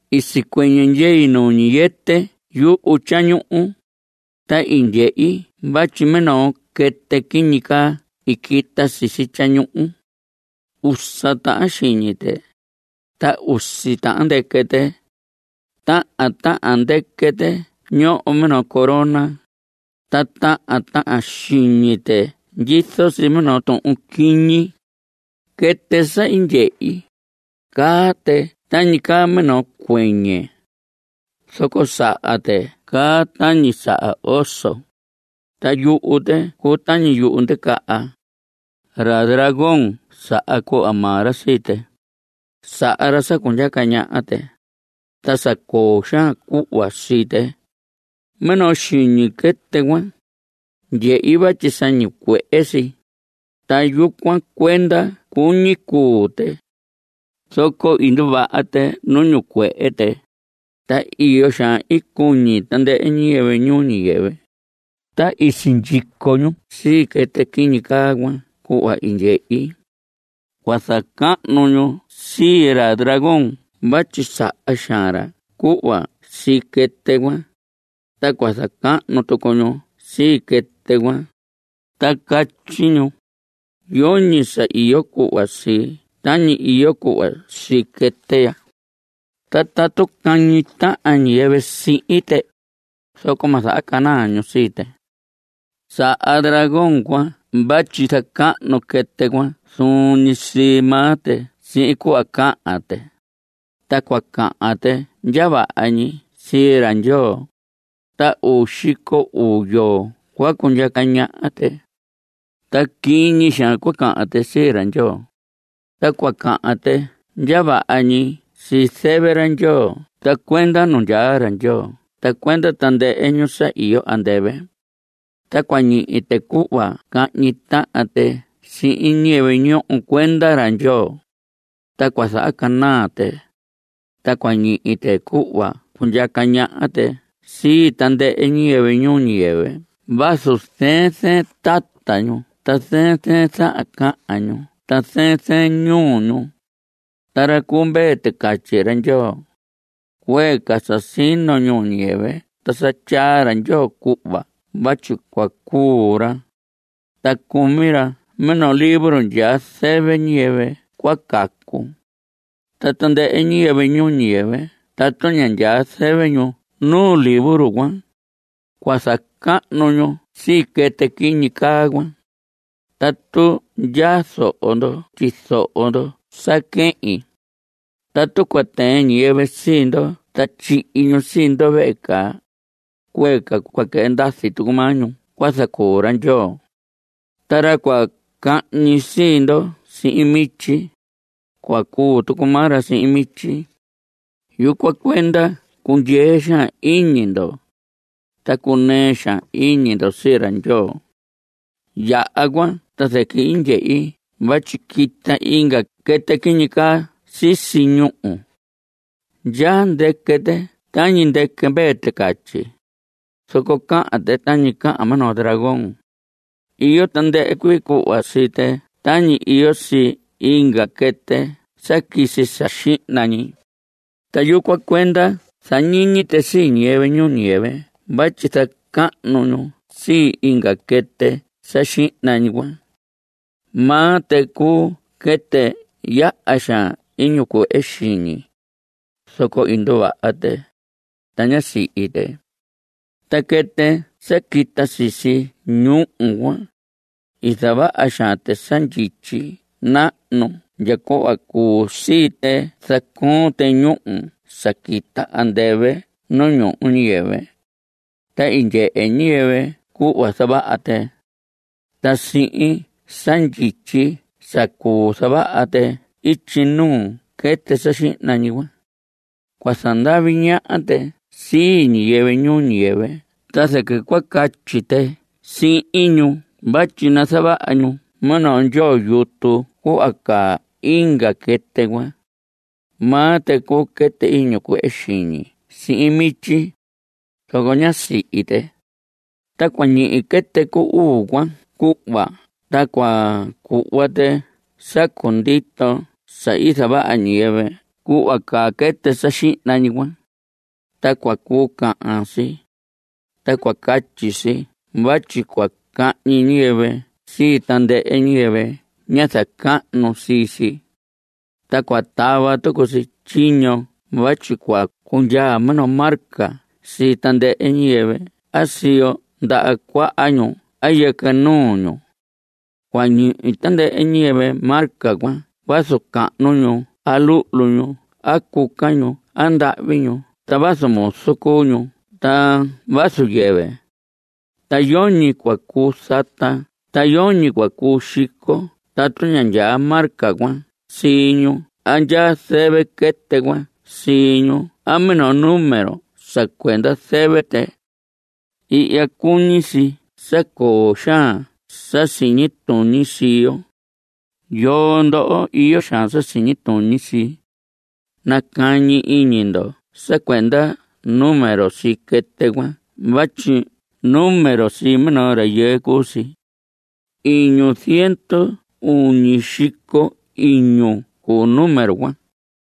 I sicuɨñɨ ndyei nu ñiyɨtɨ yuhu tyañuhu, ta i ndyehi vatyi minoo quɨtɨ quiñi caa i quita sisi tyañuhu. Usa tahan xiñi tɨ, ta usi tahan ndɨquɨ tɨ. Tahan tahan ndɨquɨ tɨ ñoho minoo corona. Ta tahan tahan xiñi tɨ ndyizo si minoo tuhun quiñi. Quɨtɨ sa i ndyehi, caa tɨ tañi caa minoo cuɨñɨ. Zoco saha tɨ caa tañi saha oso, ta yuhu tɨ cuu tañi yuhu ndicaha. Ra dragón saha cuhva maa ra sii tɨ. Saha ra sa cundyaca ñaha tɨ, ta sa coo xaan cuhva sii tɨ. Minoo xiñi quɨtɨ cuan, ndyehi vatyi sa ñicuehe si, ta yucuan cuenda cuñi cuu tɨ. Zoco i nduvaha tɨ nu ñicuehe tɨ, ta iyo xaan i cuñi tandɨhɨ ñiyɨvɨ ñuu ñiyɨvɨ, ta i sindyico ñu sii quɨtɨ quiñi caa cuan cuhva i ndyehi. Cua zacahnu ñu sii ra dragón vatyi saha xaan ra cuhva sii quɨtɨ cuan, ta cua zacahnu tucu ñu sii quɨtɨ cuan, ta catyi ñu: Yoñi sa iyo cuhva sii tañi iyo cuhva sii quɨtɨ ya. Tatu cahñi tahan ñiyɨvɨ sihin tɨ, zoco ma zahacanaa ñu sii tɨ. Saha dragón cuan vatyi zacahnu quɨtɨ cuan zuun ñi sii maa tɨ sihin cuhva cahan tɨ, ta cua cahan tɨ ndya vaha ñi sii ra Ndyoo. Ta uu xico uu yoo cua cundyaca ñaha tɨ. Ta quiñi xaan cua cahan tɨ sii ra Ndyoo, ta cua cahan tɨ ndya vaha ñi sii zɨvɨ ra Ndyoo ta cuenda nu ndyaa ra Ndyoo ta cuenda tandɨhɨ ñu sa iyo andɨvɨ. Ta cua ñihi tɨ cuhva cahñi tahan tɨ sihin ñiyɨvɨ ñoho cuenda ra Ndyoo, ta cua zahacanaa tɨ. Ta cua ñihi tɨ cuhva cundyaca ñaha tɨ sii tandɨhɨ ñiyɨvɨ ñuu ñiyɨvɨ vazu zɨɨn zɨɨn tata ñu ta zɨɨn zɨɨn zahan cahan ñu ta zɨɨn zɨɨn ñuu ñu. Ta ra cu Mvee Ticatyi ra Ndyoo, cuee ca sa sino ñuu ñiyɨvɨ ta sa tyaa ra Ndyoo cuhva vatyi cua cuu ra, ta cumi ra minoo libro ndyaa zɨvɨ ñiyɨvɨ cua cacu. Ta tandɨhɨ ñiyɨvɨ ñuu ñiyɨvɨ tatu ña ndyaa zɨvɨ ñu nu libro cuan, cua zacahnu ñu sii quɨtɨ quiñi caa cuan. Tatu ndyaa zoho ndo, tyizoho ndo sa quehin. Tatu cua tɨɨn ñiyɨvɨ sii ndo ta tyihi ñu sii ndo vehe caa, cuee ca cua quɨhɨ ndazi tucu maa ñu cua zacuu ra Ndyoo. Ta ra cua cahñi sii ndo sihin mityi, cua cuu tucu maa ra sihin mityi. Yucuan cuenda cundyee xaan iñi ndo, ta cunɨɨ xaan iñi ndo sii ra Ndyoo. Yaha cuan ta zɨquɨ i ndyehi vatyi quita inga quɨtɨ quiñi caa sisi ñuhu. Ndyaa ndɨquɨ tɨ tañi ndɨquɨ mvee ticatyi, zoco cahan tɨ tañi cahan minoo dragón. Iyo tandɨhɨ cuii cuhva sii tɨ tañi iyo sii inga quɨtɨ sa quisi sa xihna ñi, ta yucuan cuenda zañiñi tɨ sii ñiyɨvɨ ñuu ñiyɨvɨ vatyi zacahnu ñu sii inga quɨtɨ sa xihna ñi cuan. Maa tɨ cuu quɨtɨ yaha xaan iñi cuehe xiñi, zoco i nduvaha tɨ, ta ñá sihi tɨ. Ta quɨtɨ sa quita sisi ñuhu cuan, i zavaha xaan tɨ sa ndyityi nahnu ndya cuhva cuu sii tɨ zacoon tɨ ñúhu sa quita andɨvɨ nu ñuhu ñuu ñiyɨvɨ. Ta i ndyehe ñiyɨvɨ cuhva zavaha tɨ. Ta sihin sa ndyityi sa cuu zavaha tɨ ityi nuu quɨtɨ sa xihna ñi cuan, cua zandavi ñaha tɨ sii ñiyɨvɨ ñuu ñiyɨvɨ ta zɨquɨ cua catyi tɨ sihin ñu vatyi nazavaha ñu minoo ndyoo yutu cuhva caa inga quɨtɨ cuan. Maa tɨ cuu quɨtɨ ñicuehe xiñi sihin mityi, zoco ñá sihi tɨ. Ta cua ñihi quɨtɨ cu uu cuan cuhva ta cua cuhva tɨ sa cundito sa i zavaha ñiyɨvɨ cuhva caa quɨtɨ sa xihna ñi cuan. Ta cua cuu cahan si, ta cua catyi si vatyi cua cahñi ñiyɨvɨ sii tandɨhɨ ñiyɨvɨ ña zacahnu sii si. Ta cua tava tucu si tyiño vatyi cua cundyaa minoo marca sii tandɨhɨ ñiyɨvɨ a siyo ndaha cuaha ñu a yɨquɨ nuu ñu. Cua ñihi tandɨhɨ ñiyɨvɨ marca cuan vazu cahnu ñu a luhlu ñu a cuca ñu a ndahvi ñu ta vazu muzu cuu ñu ta vazu yɨvɨ. Ta yoñi cua cuu zata ta yoñi cua cuu xico tatu ña ndyaa marca cuan sii ñu a ndyaa zɨvɨ quɨtɨ cuan sii ñu a minoo número sa cuenda zɨvɨ tɨ. Ihya cuñi si sa coo xaan sa siñi tuñi sii yo. Yoo ndoho iyo xaan sa siñi tuñi sii, nacañi iñi ndo sa cuenda número sii quɨtɨ cuan vatyi número sii minoo rayɨɨ cuu si. Iñu ziendu uñi xico iñu cuu número cuan.